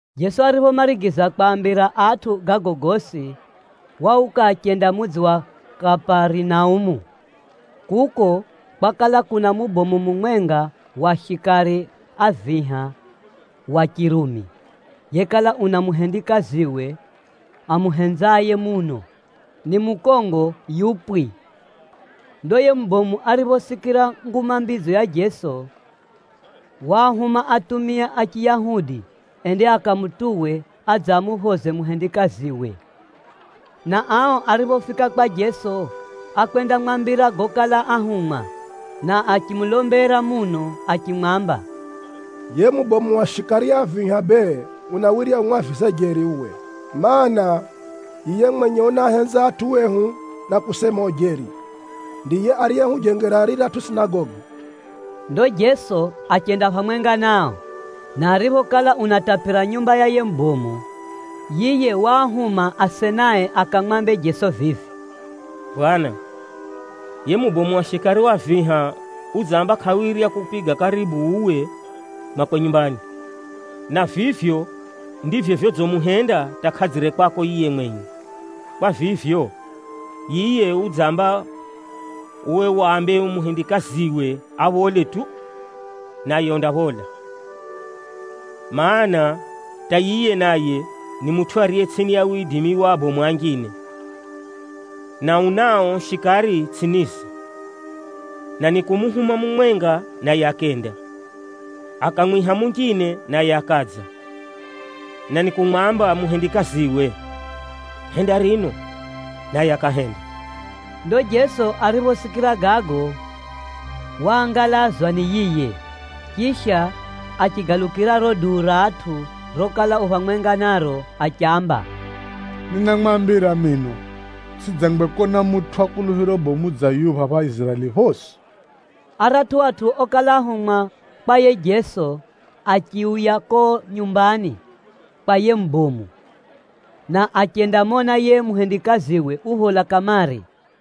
Jeso ariphomarigiza kwaambira atʼu gago gosi, wauka achenda mudzi wa Kaparinaumu. Kuko kwakala kuna mubomu mumwenga wa shikari a viha wa Chirumi, yekala una muhendikaziwe amuhenzaye muno, ni mukongo yupwi. Ndo yiye mubomu ariphosikira nguma mbidzo ya Jeso, waahuma atumia a Chiyahudi ende akamutuwe adze amuphoze muhendikaziwe. Na ao ariphofika kwa Jeso, ákwendamwambira gokala áhumwa, na achimulombera muno achimwamba, “Yiye mubomu wa shikari a viha bee unawirya umwavize jeri uwe, mana, yiye mwenye unaahenza atʼu ehu na kusema ujeri, ndiye ariyehujengera riratʼu sinagogi.” Ndo Jeso achenda phamwenga nao, na ariphokala unatapira nyumba ya yiye mubomu wa shikari, yiye waahuma asenae akamwambe Jeso vivi, “Bwana, yiye mubomu wa shikari a viha udzamba kʼawirya kukupiga karibu uwe mwakwe nyumbani, na vivyo ndivyo vyodzimuhenda hata kʼadzire kwako yiye mwenye. Kwa vivyo, yiye udzamba uwe wambe muhendikaziwe aphole tu, naye undaphola. Maana, hata yiye naye ni mutʼu ariye tsʼini ya widimi wa abomu anjine, na unao shikari tsʼinize. Na nikumuhuma mumwenga naye akenda, akamwiha munjine naye akadza, na nikumwamba muhendikaziwe, ‘Henda rino!’ naye akahenda.” Ndo Jeso ariphosikira gago, waangalazwa ni yiye, chisha achigalukira riro duu ra atʼu rokala u phamwenga naro achiamba, “Ninamwambira mino, tsʼidzangwe kona mutʼu wa kuluphiro bomu dza yuyu phapha Iziraeli phosi!” Aratʼu atʼu okala ahumwa kwa yiye Jeso achiuya kuko nyumbani kwa yiye mubomu, na achendamona yiye muhendikaziwe uphola kamare.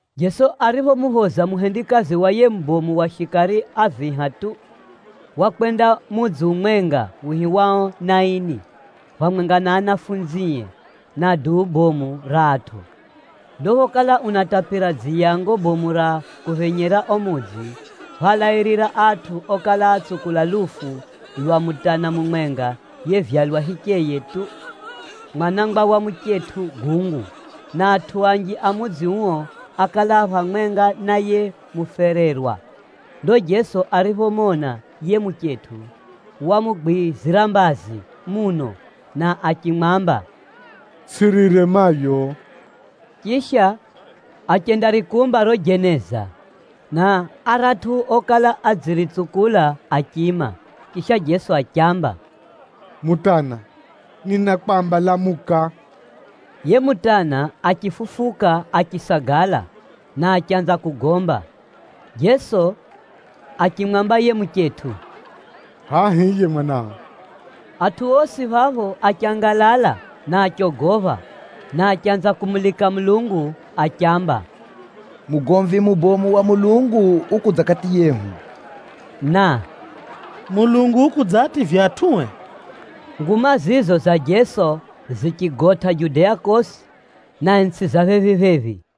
Jeso ariphomuphoza muhendikazi wa yiye mubomu wa shikari a viha tu, wakwenda mudzi umwenga wihiwao Naini, phamwenga na anafunzie, na duu bomu ra atʼu. Ndo phokala unatapira dziyango bomu ra kuphenyera uo mudzi, phálairira atʼu okala atsukula lufu lwa mutana mumwenga yevyalwa hicheye tu, mwanangwa wa muchetʼu gungu, na atʼu anji a mudzi uo ákala a phamwenga na yiye mufererwa. Ndo Jeso ariphomona yiye muchetʼu, wamugwizira mbazi muno na achimwamba, “Tsʼirire Mayo.” Chisha, achendarikumba riro jeneza, na aratʼu okala adziritsukula achiima. Chisha Jeso achiamba, “Mutana, ninakwamba lamuka!” Yiye mutana achifufuka achisagala, na achanza kugomba. Jeso achimwamba yiye muchetʼu, “Hʼaya hiye mwanao.” Atʼu osi phapho achangalala na achogopha, na achanza kumulika Mulungu achiamba, “Mugomvi mubomu wa Mulungu ukudza kati yehu!” na, “Mulungu ukudzaativya atʼue!” Nguma zizo za Jeso zichigotʼa Judea kosi, na itsʼi za phephi-phephi.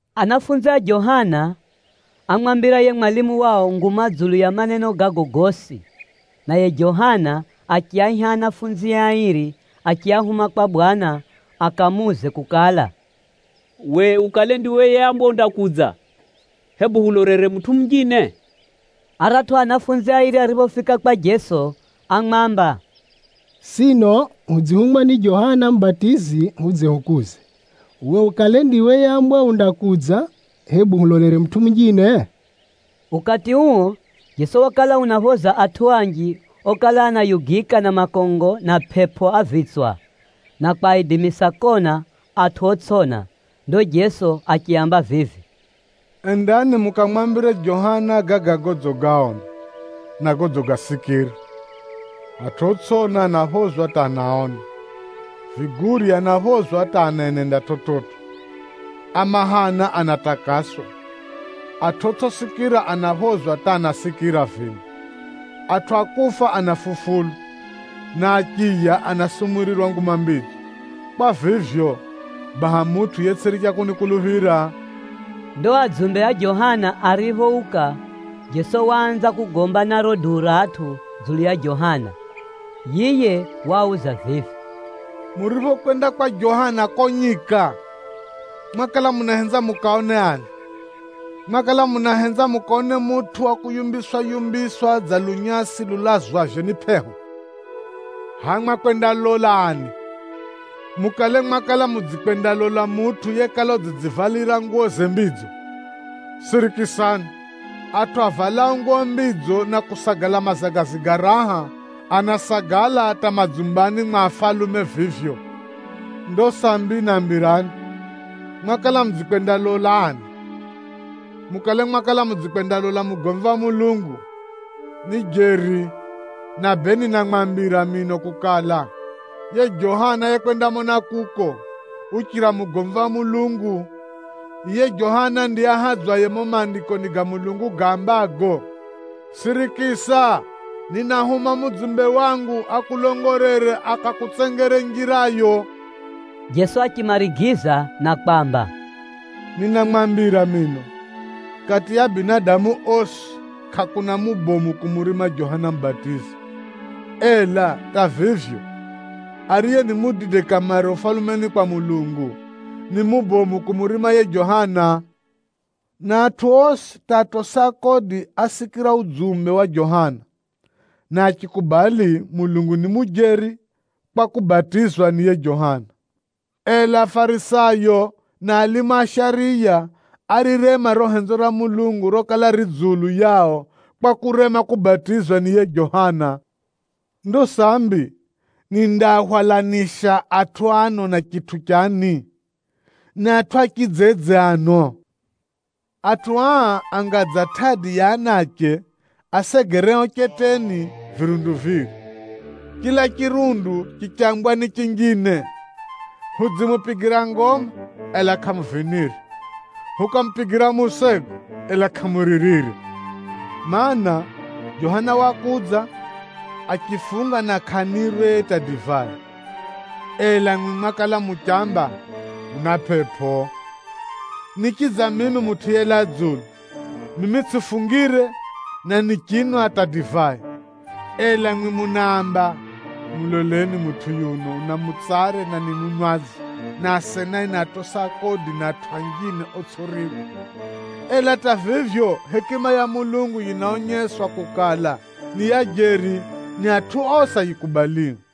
Anafunzi a Johana ámwambira yiye mwalimu wao nguma dzulu ya maneno gago gosi. Naye Johana achiaiha anafunzie airi achiahuma kwa Bwana akamuuze kukala, “Uwe ukale ndiwe yeambwa undakudza, hebu hulolere mutʼu munjine?” Aratʼu anafunzi airi ariphofika kwa Jeso ámwamba, “Sino hudzihumwa ni Johana Mubatizi hudze hukuuze, ‘Uwe ukale ndiwe yeambwa undakudza, hebu hulolere mutʼu munjine?’” Ukati uo, Jeso wakala unaaphoza atʼu anji okala anayugika na makongo na pʼepʼo a vitswa, na kwaidimisa kona atʼu otsʼiona. Ndo Jeso achiaamba vivi, “Endani mukamwambire Johana gaga godzigaona, na godzigasikira: atʼu otsʼiona anaphozwa hata anaona, vigurye anaphozwa hata anenenda chividzo, a mahana anatakaswa, atʼu otsʼisikira anaphozwa hata anasikira vino, atʼu a kufa anafufulwa, na achiya anasumurirwa Nguma Mbidzo. Kwa vivyo, baha mutʼu yetsʼiricha kunikuluphira!” Ndo adzumbe a Johana ariphouka, Jeso waanza kugomba na riro duu ra atʼu dzulu ya Johana. Yiye waauza vivi, “Muriphokwenda kwa Johana kuko nyika, mwakala munahenza mukaone ani? Mwakala munahenza mukaone mutʼu wa kuyumbiswa-yumbiswa dza lunyasi lulazwavyo ni pʼeho? Hʼaya mwakwendalola ani? Mukale mwakala mudzikwendalola mutʼu yekala udzidzivalira nguwoze mbidzo? Sirikisani, atʼu avalao nguwo mbidzo na kusagala mazagazi ga raha, anasagala hata madzumbani mwa afalume vivyo! Ndo sambi nambirani, mwakala mudzikwendalola ani? Mukale mwakala mudzikwendalola mugomvi wa Mulungu? Ni jeri, na bee ninamwambira mino kukala, yiye Johana yekwendamona kuko, uchira mugomvi wa Mulungu. Yiye Johana ndiye ahadzwaye mumo Maandikoni ga Mulungu gaambago, ‘Sirikisa, ninahuma mudzumbe wangu akulongolere, akakutsengere njirayo.’” Jeso achimarigiza na kwamba, “Ninamwambira mino, kati ya binadamu osi, kʼakuna mubomu kumurima Johana Mubatizi. Ela hata vivyo, ariye ni mudide kamare Ufalumeni kwa Mulungu, ni mubomu kumurima yiye Johana. Na atʼu osi hata atosi a kodi ásikira udzumbe wa Johana, na achikubali Mulungu ni mujeri kwa kubatizwa ni yiye Johana. Ela Afarisayo na alimu a shariya árirema riro henzo ra Mulungu rokala ri dzulu yao kwa kurema kubatizwa ni yiye Johana. “Ndo sambi nindaahwalanisha atʼu ano na chitʼu chani? Ni atʼu a chidzedze ano? Atʼu aa anga dza tʼadi ya anache asegereo cheteni virundu viri, chila chirundu chichambwa ni chinjine, ‘Hudzimupigira ngoma, ela kʼamuvinire! Hukamupigira musego, ela kʼamuririre!’ Maana, Johana Mubatizi wakudza, achifunga na kʼanirwe hata divai, ela mwimwi mwakala muchamba, ‘Una pʼepʼo!’ Nichidza mimi Mutʼu yelaa dzulu. Mimi tsʼifungire na nichinwa hata divai, ela mwimwi munaamba, ‘Muloleni mutʼu yuno, una mutsare na ni munwadzi, na asenae ni atosi a kodi na atʼu anjine otsʼiriwa.’ Ela hata vivyo, hekima ya Mulungu yinaonyeswa kukala ni ya jeri ni atʼu osi ayikubalio.”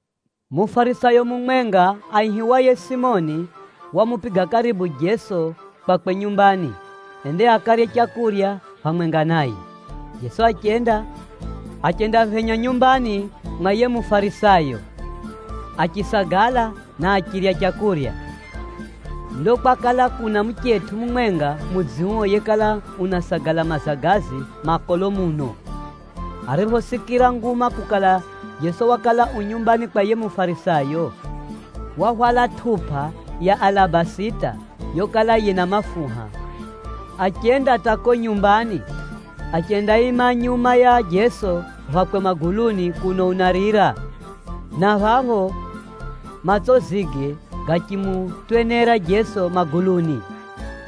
Mufarisayo mumwenga aihiwaye Simoni wamupiga karibu Jeso kwakwe nyumbani, ende akarye leu phamwenga naye. Jeso achenda, achendaphenya nyumbani mwa yiye Mufarisayo, achisagala na achirya leu. Ndo kwakala kuna muchetʼu mumwenga mudzi uo yekala unasagala mazagazi makolo muno. Ariphosikira nguma kukala Jeso wakala u nyumbani kwa yiye Mufarisayo, wahwala tʼupa ya alabasita yokala yina mafuha. Achenda hata kuko nyumbani, achendaima nyuma ya Jeso phakwe maguluni kuno unarira, na phapho matsozige gachimutwenera Jeso maguluni.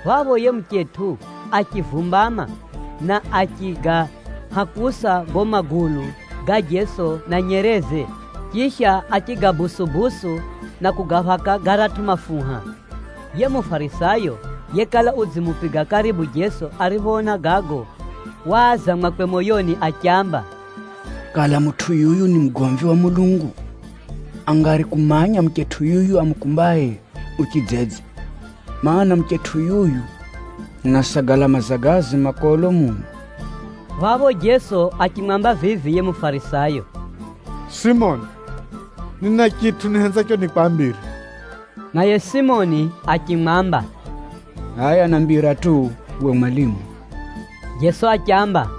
Phapho yiye muchetʼu achivumbama na achigahakusa gago magulu ga Jeso na nyereze, chisha achigadonera-donera na kugaphaka garatʼu mafuha. Yiye Mufarisayo yekala udzimupiga karibu Jeso ariphoona gago, waaza mwakwe moyoni achiamba, “Kala mutʼu yuyu ni mugomvi wa Mulungu, angari kumanya muchetʼu yuyu amukumbaye yu chidzedze, mana, muchetʼu yuyu unasagala mazagazi makolo muno.” Phapho Jeso achimwamba vivi yiye Mufarisayo, “Simoni, nina chitʼu nihenzacho nikwambire.” Naye Simoni achimwamba, “Hʼaya nambira tu uwe Mwalimu.” Jeso achiamba,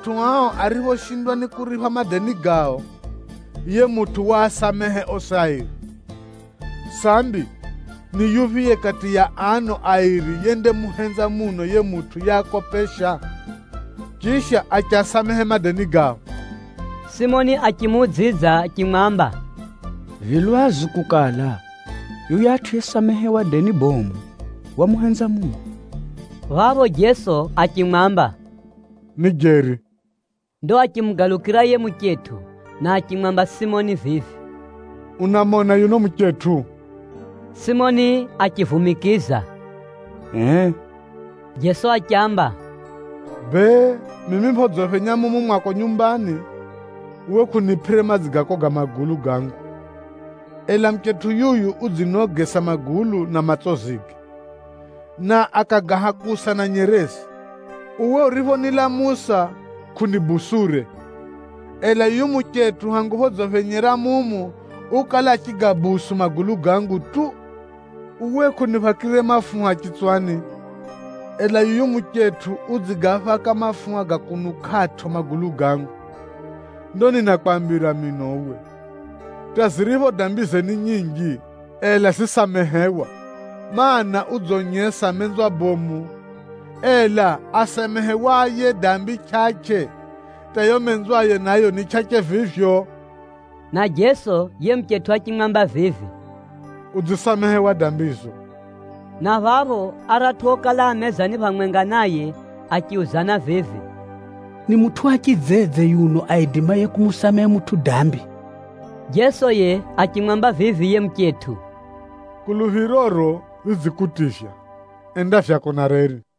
Atʼu ao ariphoshindwa ni kuripha madeni gao, yiye mutʼu wasamehe osi airi. Sambi, ni yuphiye kati ya ano airi yendamuhenza muno yiye mutʼu yeakopesha, chisha achiasamehe madeni gao?” Simoni achimuudzidza achimwamba, “Vi lwazu kukala, yuyatʼu yesamehewa deni bomu, wamuhenza muno.” Phapho Jeso achimwamba, “Ni jeri.” Ndo achimugalukira yiye muchetʼu na achimwamba Simoni vivi, “Unamona yuno muchetʼu?” Simoni achivumikiza, “Ee?” Jeso achiamba, “Bee, mimi phodziphenya mumu mwako nyumbani, uwe kʼunipʼire madzi ga koga magulu gangu, ela muchetʼu yuyu udzinogesa magulu na matsozige, na akagahakusa na nyereze. Uwe uriphonilamusa kʼunibusure, ela yuyu muchetʼu hangu phodziphenyera mumu ukala achigadonera magulu gangu tu. Uwe kʼuniphakire mafuha chitswani, ela yuyu muchetʼu udzigaphaka mafuha ga kunukʼatʼo magulu gangu. Ndo ninakwambira mino uwe, hata ziripho dambize ni nyinji, ela zisamehewa, mana, udzonyesa menzwa bomu. Ela asamehewaye dambi chʼachʼe, hata yiyo menzwaye nayo ni chʼachʼe vivyo.” Na Jeso yiye muchetʼu achimwamba vivi, “Udzisamehewa dambizo.” Na phapho aratʼu okala a mezani phamwenga naye achiuzana vivi, “Ni mutʼu wa chidzedze yuno aidimaye kumusamehe mutʼu dambi?” Jeso yiye achimwamba vivi yiye muchetʼu, “Kuluphiroro ridzikutivya enda vyako na reri.”